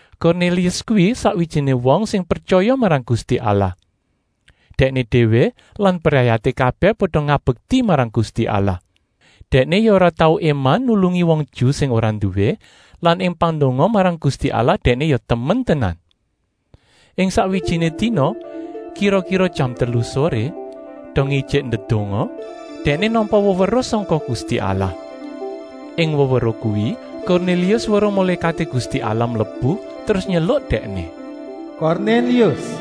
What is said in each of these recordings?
Kornélius kuwi sakwijiné wong sing pretyaya marang Gusti Allah. Dèkné déwé lan brayaté kabèh pada ngabekti marang Gusti Allah. Dèkné ya ora tau éman ngulungi wong Ju sing ora nduwé lan ing pandonga marang Gusti Allah dèkné ya temen tenan. Ing sakwijiné dina, kira-kira jam telu soré, dongé ijik ndedonga, dèkné nampa weweruh sangka Gusti Allah. Ing weweruh kuwi Kornélius weruh mulékaté Gusti Allah mlebu terus nyeluk dèkné: “Kornélius!”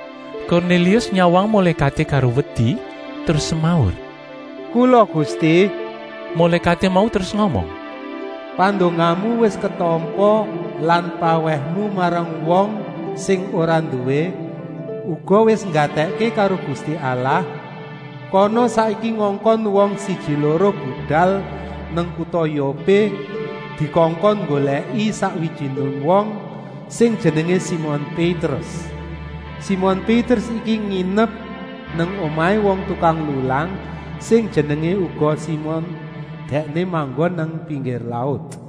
Kornélius nyawang mulékaté karo wedi terus semaur: “Kula Gusti!” Mulékaté mau terus ngomong: “Pandongamu wis ketampa lan pawèhmu marang wong sing ora nduwé uga wis nggatèkké karo Gusti Allah. Kana saiki ngongkon wong siji-loro budal nang kuta Yopé dikongkon nggolèki sakwijiné wong sing jenengé Simon Pétrus. Simon Pétrus iki nginep nang omahé wong tukang lulang sing jenengé uga Simon. Dèkné manggon nang pinggir laut.”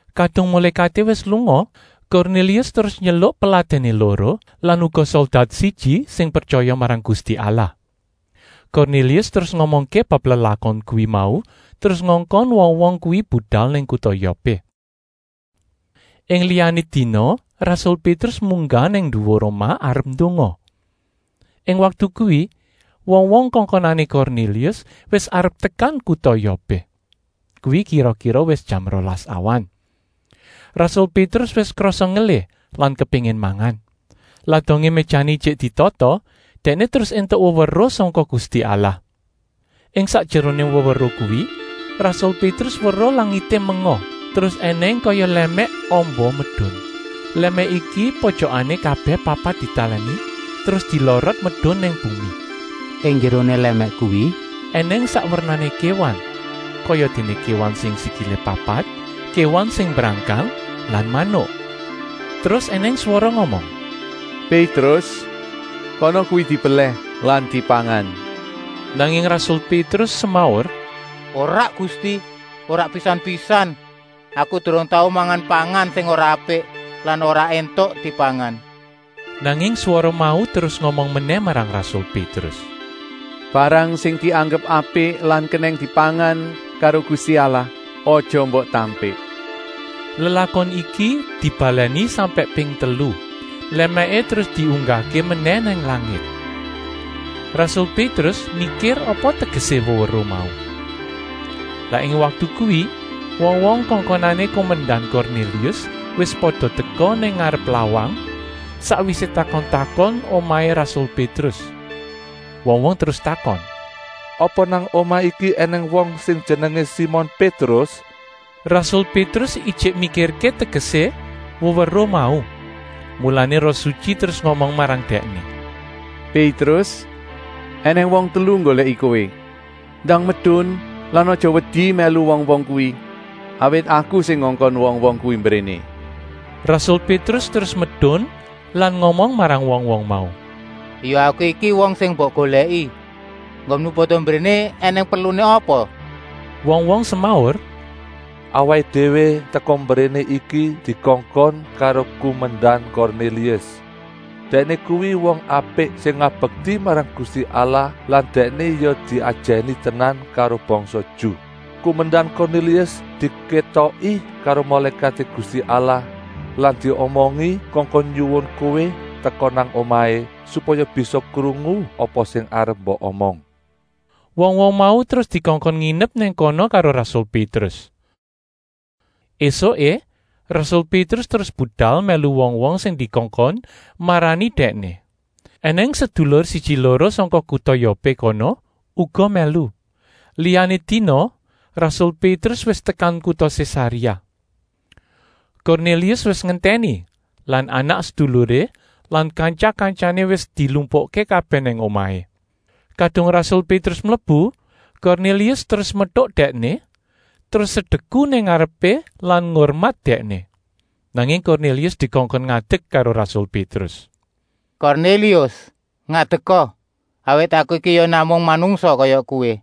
Kadung mulékaté wis lunga Kornélius terus nyeluk peladèné loro lan uga soldat siji sing pretyaya marang Gusti Allah. Kornélius terus ngomongké bab lelakon kuwi mau terus ngongkon wong-wong kuwi budal nang kuta Yopé. Ing liyané dina rasul Pétrus munggah nang nduwur omah arep ndonga. Ing waktu kuwi wong-wong kongkonané Kornélius wis arep tekan kuta Yopé. Kuwi kira-kira wis jam rolas awan. Rasul Pétrus wis krasa ngelih lan kepéngin mangan. Lah dongé méjané ijik ditata, dèkné terus éntuk weweruh sangka Gusti Allah. Ing sakjeroné weweruh kuwi rasul Pétrus weruh langité menga terus ènèng kaya lèmèk amba medun. Lèmèk iki pojokané kabèh papat ditalèni terus dilorot medun nang bumi. Ing njeroné lèmèk kuwi ènèng sak wernané kéwan, kayadéné kéwan sing sikilé papat, kéwan sing mbrangkang lan manuk. Terus ènèng swara ngomong: “Pétrus, kana kuwi dibelèh lan dipangan!” Nanging rasul Pétrus semaur: “Ora Gusti, ora pisan-pisan! Aku durung tau mangan pangan sing ora apik lan ora éntuk dipangan.” Nanging swara mau terus ngomong menèh marang rasul Pétrus: “Barang sing dianggep apik lan kenèng dipangan karo Gusti Allah aja mbok tampik!” Lelakon iki dibalèni sampèk ping telu. Lèmèké terus diunggahké menèh nang langit. Rasul Pétrus mikir apa tegesé weweruh mau. Lah ing waktu kuwi wong-wong kongkonané kumendan Kornélius wis pada teka nang ngarep lawang, sakwisé takon-takon omahé rasul Pétrus. Wong-wong terus takon: “Apa nang omah iki ènèng wong sing jenengé Simon Pétrus?” Rasul Pétrus ijik mikirké tegesé weweruh mau, mulané Roh Sutyi terus ngomong marang dèkné: “Pétrus, ènèng wong telu nggolèki kowé. Ndang medun lan aja wedi mèlu wong-wong kuwi, awit Aku sing ngongkon wong-wong kuwi mbréné.” Rasul Pétrus terus medun lan ngomong marang wong-wong mau: “Ya aku iki wong sing mbok golèki. Enggonmu pada mbréné ènèng perluné apa?” Wong-wong semaur: “Awaké déwé teka mbréné iki dikongkon karo kumendan Kornélius. Dèkné kuwi wong apik sing ngabekti marang Gusti Allah lan dèkné ya diajèni tenan karo bangsa Ju. Kumendan Kornélius dikétoki karo mulékaté Gusti Allah lan diomongi kongkon nyuwun kowé teka nang omahé, supaya bisa krungu apa sing arep mbok omong.” Wong-wong mau terus dikongkon nginep nang kono karo rasul Pétrus. Esuké rasul Pétrus terus budal mèlu wong-wong sing dikongkon marani dèkné. Enèng sedulur siji-loro sangka kuta Yopé kono uga mèlu. Liyané dina rasul Pétrus wis tekan kuta Sésaréa. Kornélius wis ngentèni lan anak-seduluré lan kantya-kantyané wis dilumpukké kabèh nang omahé. Kadung rasul Pétrus mlebu Kornélius terus metuk dèkné, terus sedeku nang ngarepé lan ngurmat dèkné. Nanging Kornélius dikongkon ngadek karo rasul Pétrus: “Kornélius, ngadeka, awit aku iki ya namung manungsa kaya kowé.”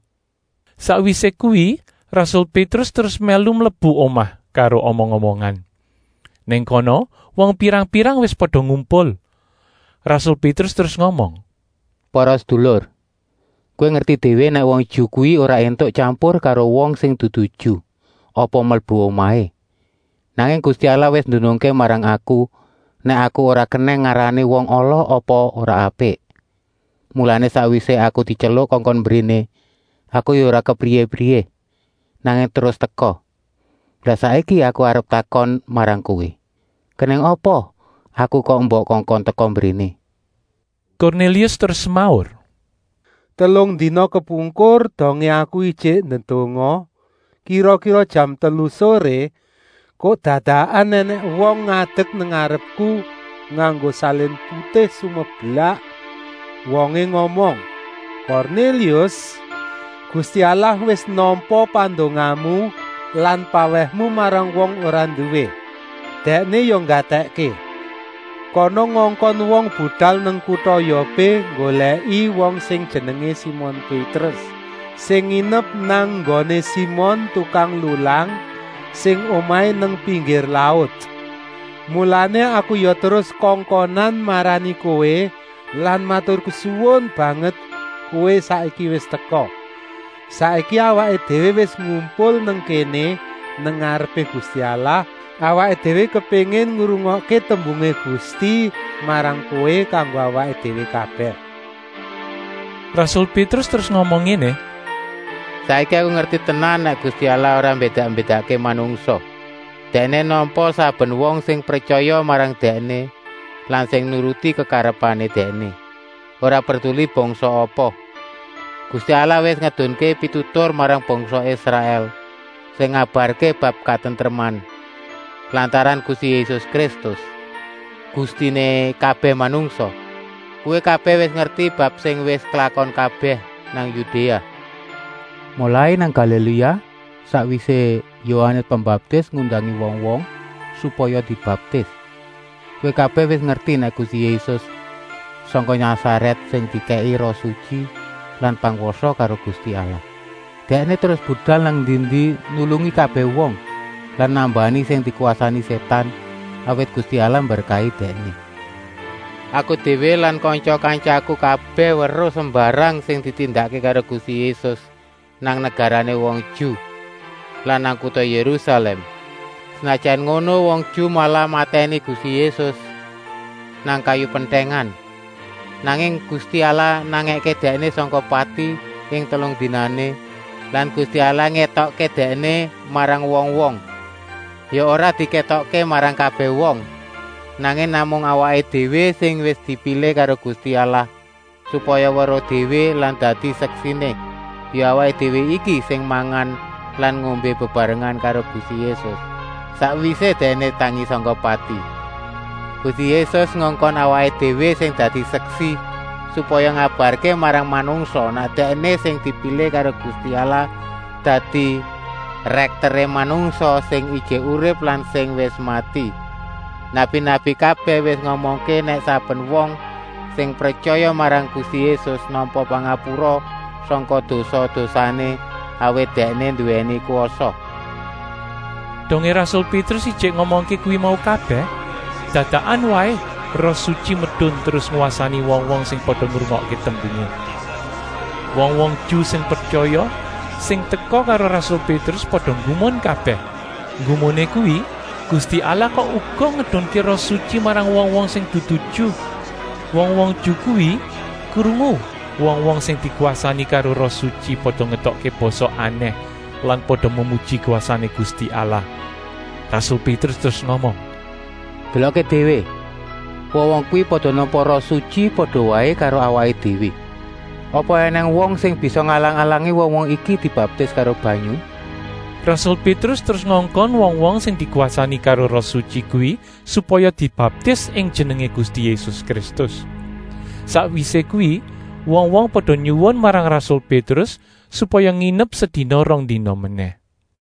Sakwisé kuwi rasul Pétrus terus mèlu mlebu omah karo omong-omongan. Nang kono wong pirang-pirang wis pada ngumpul. Rasul Pétrus terus ngomong: “Para sedulur, kowé pada ngerti déwé nèk wong Ju kuwi ora éntuk tyampur karo wong sing dudu Ju apa mlebu omahé. Nanging Gusti Allah wis ndunungké marang aku nèk aku ora kenèng ngarani wong ala apa ora apik. Mulané, sakwisé aku dityeluk kongkon mbréné, aku ya ora kepriyé-priyé, nanging terus teka. Lah saiki aku arep takon marang kowé, kenèng apa aku kok mbok kongkon teka mbréné?” Kornélius terus semaur: “Telung dina kepungkur, dongé aku ijik ndedonga, kira-kira jam telu soré, kok dadakan ènèng wong ngadek nang ngarepku nganggo salin putih sumeblak. Wongé ngomong: ‘Kornélius, Gusti Allah wis nampa pandongamu lan pawèhmu marang wong ora nduwé Dèkné ya nggatèkké. Kana ngongkon wong budal nang kuta Yopé nggolèki wong sing jenengé Simon Pétrus, sing nginep nang nggoné Simon tukang lulang, sing omahé nang pinggir laut.’ Mulané aku ya terus kongkonan marani kowé lan maturkesuwun banget kowé saiki wis teka. Saiki awaké déwé wis ngumpul nang kéné nang ngarepé Gusti Allah, awaké déwé kepéngin ngrungokké tembungé Gusti marang kowé kanggo awaké déwé kabèh.” Rasul Pétrus terus ngomong ngéné: “Saiki aku ngerti tenan nèk Gusti Allah ora mbédak-mbédakké manungsa. Dèkné nampa saben wong sing pretyaya marang Dèkné lan sing nuruti kekarepané Dèkné, ora perduli bangsa apa. Gusti Allah wis ngedunké pitutur marang bangsa Israèl, sing ngabarké bab katentreman lantaran Gusti Yésus Kristus, Gustiné kabèh manungsa. Kowé kabèh wis ngerti bab sing wis klakon kabèh nang Yudéa, molai nang Galiléa, sakwisé Yohanes Pembaptis ngundangi wong-wong supaya dibaptis. Kowé kabèh wis ngerti nèk Gusti Yésus sangka Nasarèt sing dikèki Roh Sutyi lan pangwasa karo Gusti Allah. Dèkné terus budal nang endi-endi nulungi kabèh wong lan nambani sing dikwasani sétan, awit Gusti Allah mberkahi Dèkné. Aku déwé lan kantya-kantyaku kabèh weruh sembarang sing ditindakké karo Gusti Yésus nang negarané wong Ju lan nang kuta Yérusalèm. Senajan ngono, wong Ju malah matèni Gusti Yésus nang kayu pentèngan. Nanging Gusti Allah nangèké Dèkné sangka pati ing telung dinané lan Gusti Allah ngétokké Dèkné marang wong-wong. Ya ora dikétokké marang kabèh wong, nanging namung marang awaké déwé sing wis dipilih karo Gusti Allah, supaya weruh déwé lan dadi seksiné. Ya awaké déwé iki sing mangan lan ngombé bebarengan karo Gusti Yésus, sakwisé Dèkné tangi sangka pati. Gusti Yésus ngongkon awaké déwé sing dadi seksi, supaya ngabarké marang manungsa nèk Dèkné sing dipilih karo Gusti Allah dadi rèkteré manungsa sing ijik urip lan sing wis mati. Nabi-nabi kabèh wis ngomongké nèk saben wong sing pretyaya marang Gusti Yésus nampa pangapura sangka dosa-dosané, awit Dèkné nduwèni kwasa!” Dongé rasul Pétrus ijik ngomongké kuwi mau kabèh, dadakan waé Roh Sutyi medun terus ngwasani wong-wong sing pada ngrungokké tembungé. Wong-wong Ju sing pretyaya sing teka karo rasul Pétrus pada nggumun kabèh. Nggumuné kuwi, Gusti Allah kok uga ngedunké Roh Sutyi marang wong-wong sing dudu Ju. Wong-wong Ju kuwi krungu wong-wong sing dikwasani karo Roh Sutyi pada ngetokké basa anèh lan pada memuji kwasané Gusti Allah. Rasul Pétrus terus ngomong: “Delokké déwé, wong-wong kuwi pada nampa Roh Sutyi, pada waé karo awaké déwé. Apa ènèng wong sing bisa ngalang-alangi wong-wong iki dibaptis karo banyu?” Rasul Pétrus terus ngongkon wong-wong sing dikwasani karo Roh Sutyi kuwi supaya dibaptis ing jenengé Gusti Yésus Kristus. Sakwisé kuwi wong-wong pada nyuwun marang rasul Pétrus supaya nginep sedina-rongdina menèh.